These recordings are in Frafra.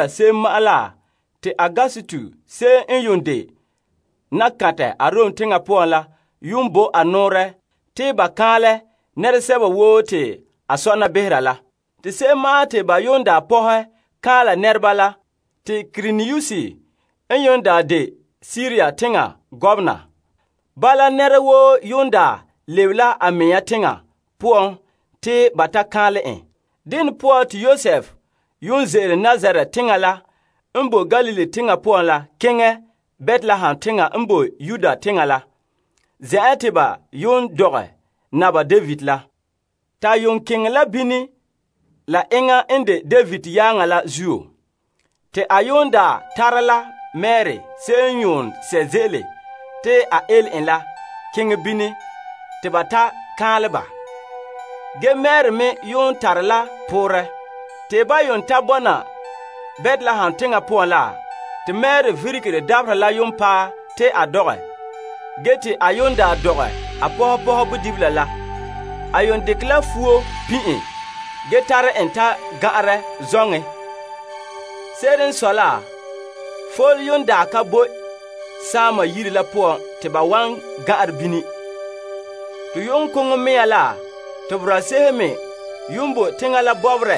Saŋsɛka te Augustus se'em n daa de nakantɛ Arom teŋa poan la yuun bo a nɔɔrɛ te ba kaanlɛ nɛresɛba woo te a sɔna behera la. Te se'em ma'an te ba pɔhɛ kaanlɛ nɛreba la te Kuirinius n yuun de Siria teŋbehera. Bala, nɛra woo lebe la a mea teŋa poan te ba ta kaanlɛ en. Dene poan te Yosef ze'ele Nazaret teŋa la n boe Galilee teŋa poan la keŋɛ Betlehem teŋa n boe Yudea teŋa la, zen'an te ba daa dɔgɛ Naba David la. A keŋɛ bini la enŋa n de David yaaŋa la zuo. Te a tare la Mari se'em wan dɛna a pɔga la keŋɛ bini te ba ta kaanlɛ ba. Ge Mari me tare la poorɛ. Te ban ta bɔna Betlehem teŋa poan la, te Mari virige, dabaherɛ la paɛ mɛ te a dɔgɛ. Ge te a dɔgɛ a pɔpɔhɛ bodibila la, a yuun dekɛ la fuo pin' en ge tare en ta gan'anrɛ zoŋen. Se'ere n sɔe la, fole ka boe saama yire la poan te ba wan gan'anrɛ bini. Te yu'uŋkoŋɔ mea la te boraa se'ehe me yuun boe teŋa la bɔbɔrɛ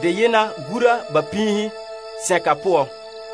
deyena gura ba piihe sɛnka poan.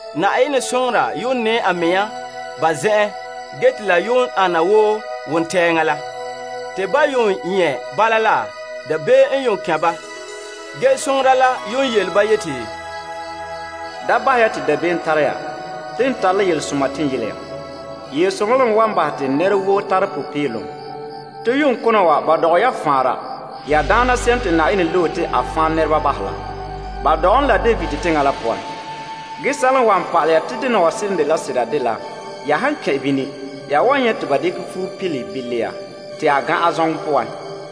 Na'ayenɛ soŋora nɛɛ a mea ba zen'en ge te la ana wo wontɛɛŋa la. Te ban nyɛ' bala la, dabeem n kɛn' ba. Ge soŋora la yele ba yeti, Da bahɛ ya te dabeem tara ya. Te n tare la yelesoma te n yele ya. Yelesoma la me wan bahɛ te nɛra woo tara popeelom. Te yu'uŋkona wa ba dɔgɛ ya faanra, ya Daana se'em te Yenɛ loe la. Ba dɔgɛ en la David teŋa la poan. Ge sɛla n wa pa'alɛ ya te dena wa seren dela sera dela ya han kɛn' bini ya wan nyɛ' te ba dekɛ fuo pile bilia te a gan'an zoŋɔ poan.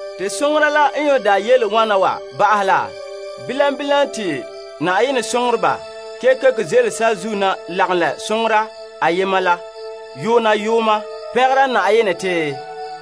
Te soŋora la n yele wana wa ba'ahɛ la, bilam bilam te Na'ayenɛ soŋoreba kekeko ze'ele saazuo na lagom la soŋora ayema la yoona yooma pɛngera Na'ayenɛ te,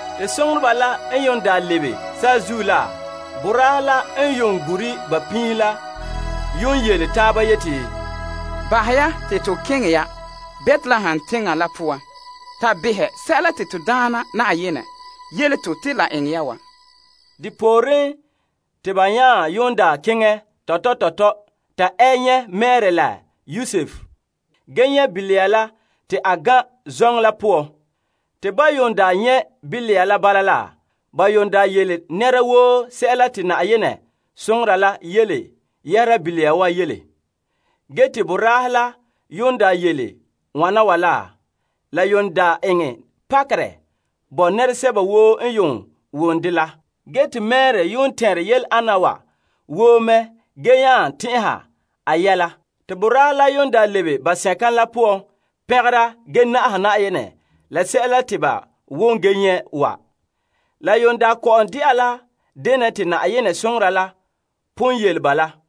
Te soŋoreba la n lebe saazuo la, boraahe la n gure ba piihe la yele taaba yeti, Bahɛ ya te to keŋɛ ya Betlehem teŋa la poan ta behɛ sɛla te to Daana Na'ayenɛ yele to te la eŋɛ ya wa. Depooren, te ba nya keŋɛ tɔtɔ tɔtɔ ta ɛ nyɛ' Mari la Yosef ge nyɛ' bilia la te a gan'an zoŋɔ la poan. Te ban nyɛ' bilia la bala la, ba yele nɛra woo sɛla te Na'ayenɛ soŋora la yele yɛhera bilia wa yele. Ge te boraahe la n yele wana wa la, la eŋɛ pakerɛ bo nɛresɛba woo n wom dɛ la. Ge te Mari yuun tɛnre yele ana wa woo mɛ ge nya tɛn'ɛha a yɛla. Te boraahe la lebe ba sɛnka la poan pɛngera ge na'aha Na'ayenɛ la sɛla te ba wom ge nyɛ' wa. La yuun kɔ'ɔn de'a la denɛ te Na'ayenɛ soŋora la pon yele ba la.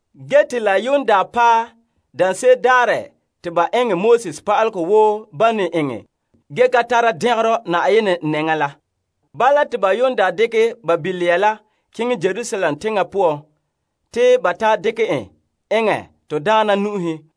Ge te la paɛ daanse'ere daarɛ te ba eŋɛ Moses Pa'alegɔ wo ban ne eŋɛ ge ka tara dɛngerɔ Na'ayenɛ nɛŋa la, bala te ba dekɛ ba bilia la keŋɛ Yerusalem teŋa poan te ba ta dekɛ en eŋɛ Na'ayenɛ nu'uhen,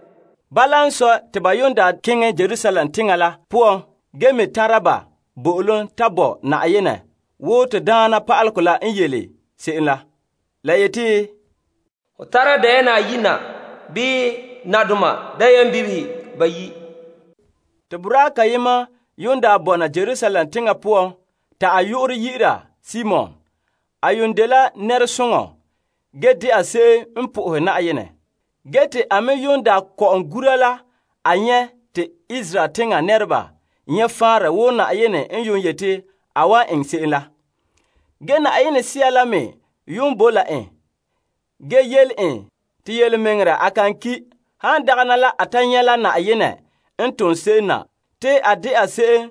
Bala n sɔe, te ba keŋɛ Yerusalem teŋa la poan ge me tara ba bo'olom wo Na'ayenɛ Pa'alegɔ la n le yele se'em la. La yeti, Ho tara dayɛna ayi', bii nadoma dayɛnbibihe bayi' na. Te boraa kayema n daa boe Yerusalem teŋa poan te a yu'urɛ dɛna Simon. A dela nɛresoŋɔ ge dɛna se'em n sohore Na'ayenɛ. Ge te a me kɔ'ɔn gura la a nyɛ' te Israel teŋa nɛreba nyɛ' faanrɛ wo Na'ayenɛ n yeti a wan eŋɛ se'em la. Ge Yenɛ Sea la boe me la en, ge yele en te yelemɛŋɛrɛ a kan ki' han dagana la a ta nyɛ' la Na'ayenɛ n tom se'em na te a de'a se'em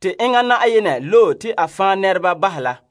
te enŋa Yenɛ loe la.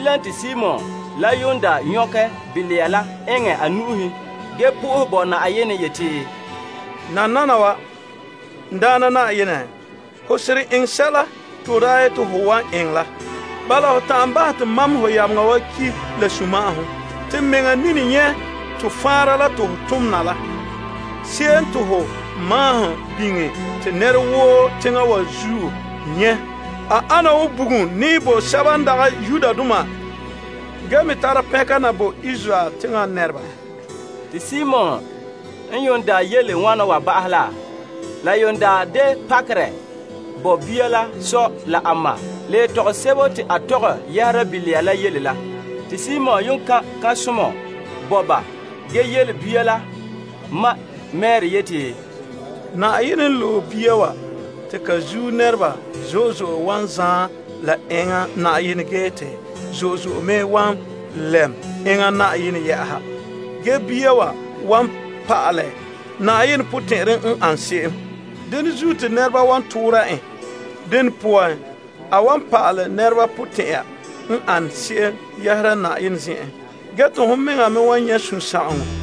te Simon nyɔkɛ bilia la eŋɛ a nu'uhen ge bo Na'ayenɛ fara yeti, Nananawa, n Daana Na'ayenɛ, ho seren eŋɛ sɛla te ho daa yeti ho wan eŋɛ la. Bala ho ta'an bahɛ te mam ho yameŋa wa ki' la sunma'ahom. Te n mea nini nyɛ' to faanra la te ho tom na la. Se'em te ho maahom biŋe te nɛra woo teŋa wa zuo nyɛ', A ane wo bugum nɛɛ bo sɛba n dagɛ Yudoma ge me tare pɛnka na bo Israel teŋa nɛreba. Te Simon n daa yele wana ba'ahɛ la. La de pakerɛ bo bia la sɔ la a ma la yetɔgom sebo te a tɔgɛ yɛhera bilia la yele la. Te Simon kan' kan'somɔ bo ba ge yele bia la ma Mari yeti, Na'ayenɛ n loe bia wa te ka zuo nɛreba zo'e zo'e wan zaan la enŋa Na'ayenɛ ge te zo'e zo'e me wan lɛm enŋa Na'ayenɛ yɛ'ɛha. Ge bia wa wan pa'alɛ Na'ayenɛ potɛn'ɛrɛ n ane se'em. Dene zuo, te nɛreba wan toora en. Dene poan, a wan pa'alɛ nɛreba potɛn'ɛra n ana se'em yɛhera Na'ayenɛ zen'en. Ge te hon mɛŋa me wan nyɛ' sunsagaŋɔ.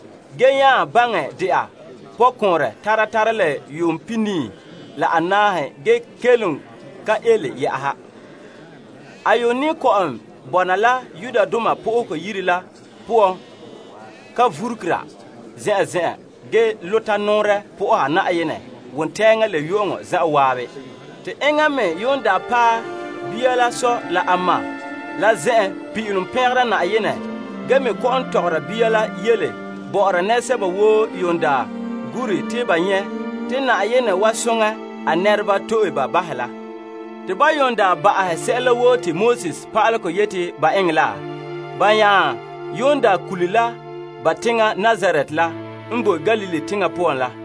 ge nya dɛna pɔkɔɔnrɛ tara tara la yuum pihinii la anaahe ge kelom ka ele yɛ'ɛha. A ne kɔ'ɔn bɔna la Yenɛ Yire la poan ka vurugera zen'an zen'an ge zagahɛ a mɛŋa soha Na'ayenɛ wontɛɛŋa la yu'uŋɔ zan'an. Te enŋa me paɛ bia la sɔ la a ma la zen'en pin'ilom pɛngera Na'ayenɛ ge me kɔ'ɔn tɔgɔra bia la yele bɔ'ɔra nɛresɛba woo daa gure te ba nyɛ' te Na'ayenɛ wa soŋɛ a nɛreba to'e ba bahɛ la. Te ban daa ba'ahɛ sɛla woo te Na'ayenɛ Pa'alegɔ yeti ba eŋɛ la, ba nya kule la ba teŋa Nazaret la n boe Galilee teŋa poan la.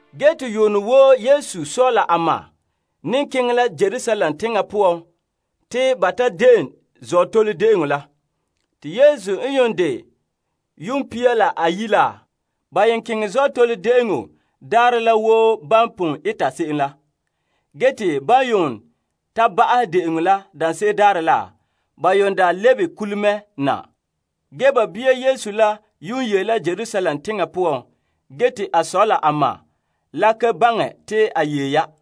Ge te yuunɛ woo Yesu sɔ la a ma ne keŋɛ la Yerusalem teŋa poan ta de'eŋ Azootole De'eŋɔ. Te Yesu n ta dɛna yuum pia la ayi' la, ba daa keŋɛ Azootole De'eŋɔ Daarɛ la mɛ wo ban pon eta se'em la. Ge te ban ta ba'ahɛ de'eŋɔ la daanse'ere daarɛ la, ba lebe kule mɛ na. Ge ba bia Yesu yee la Yerusalem teŋa poan ge te a sɔ la a ma la ka baŋɛ te a yee ya.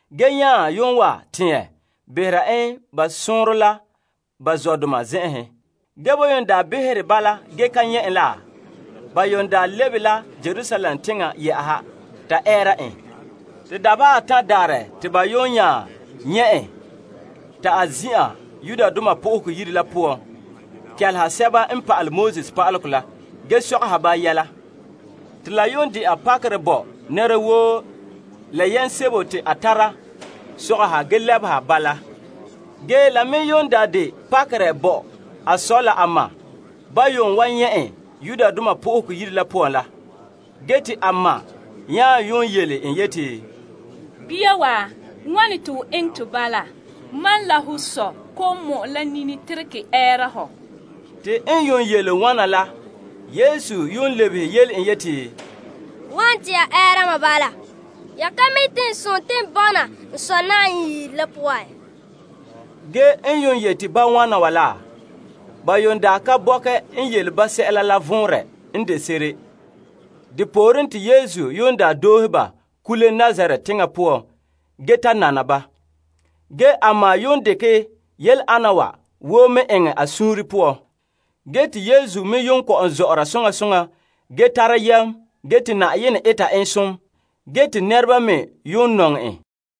Ge nya pɔhɛ ɛɛra en ba sɔɔnrɔ la ba zɔdoma zen'en. Ge ban behɛ bala ge ka nyɛ' en la, ba lebe la Yerusalem teŋa yɛ'ɛha ta ɛɛra en. Te dabeha atan' daarɛ te ba nya nyɛ' en ta zin'an Yenɛ Yire la poan kɛleha pa'alegɔ pa'aleba la ge sɔgɔha ba yɛla. Te la de'a pakerɛ bo nɛra woo la yam sebo te a tara sɔgɔha ge lebeha ba la. Ge la me de pakerɛ bo a sɔ la a ma nyɛ' en Yenɛ Yire la poan la. Ge te a ma nya yele en yeti, Bia wa, wane te ho eŋɛ to bala? Mam la ho sɔ kɔ'ɔn mɔ'ɛ la nini teregɛ ɛɛra hɔ. Te Yesu lebehe yele en yeti, Wane te ya ɛɛra mam bala? Ya ka mi' te n sontii n bɔna n Sɔ' yire la poan? Ge ba da ka bɔkɛ n yele ba sɛla la vɔnrɛ n de se'ere. De pooren te Yesu doohe ba kule Nazaret teŋa poan ge ta nana ba. Ge a ma dekɛ yele ana wa woo mɛ eŋɛ a suunre poan. Ge te Yesu me daa kɔ'ɔn zɔ'ɔra soŋa soŋa ge tara yam ge te Na'ayenɛ zo'ohogɔ bɔna a zuo ge te nɛreba me nɔŋɛ en.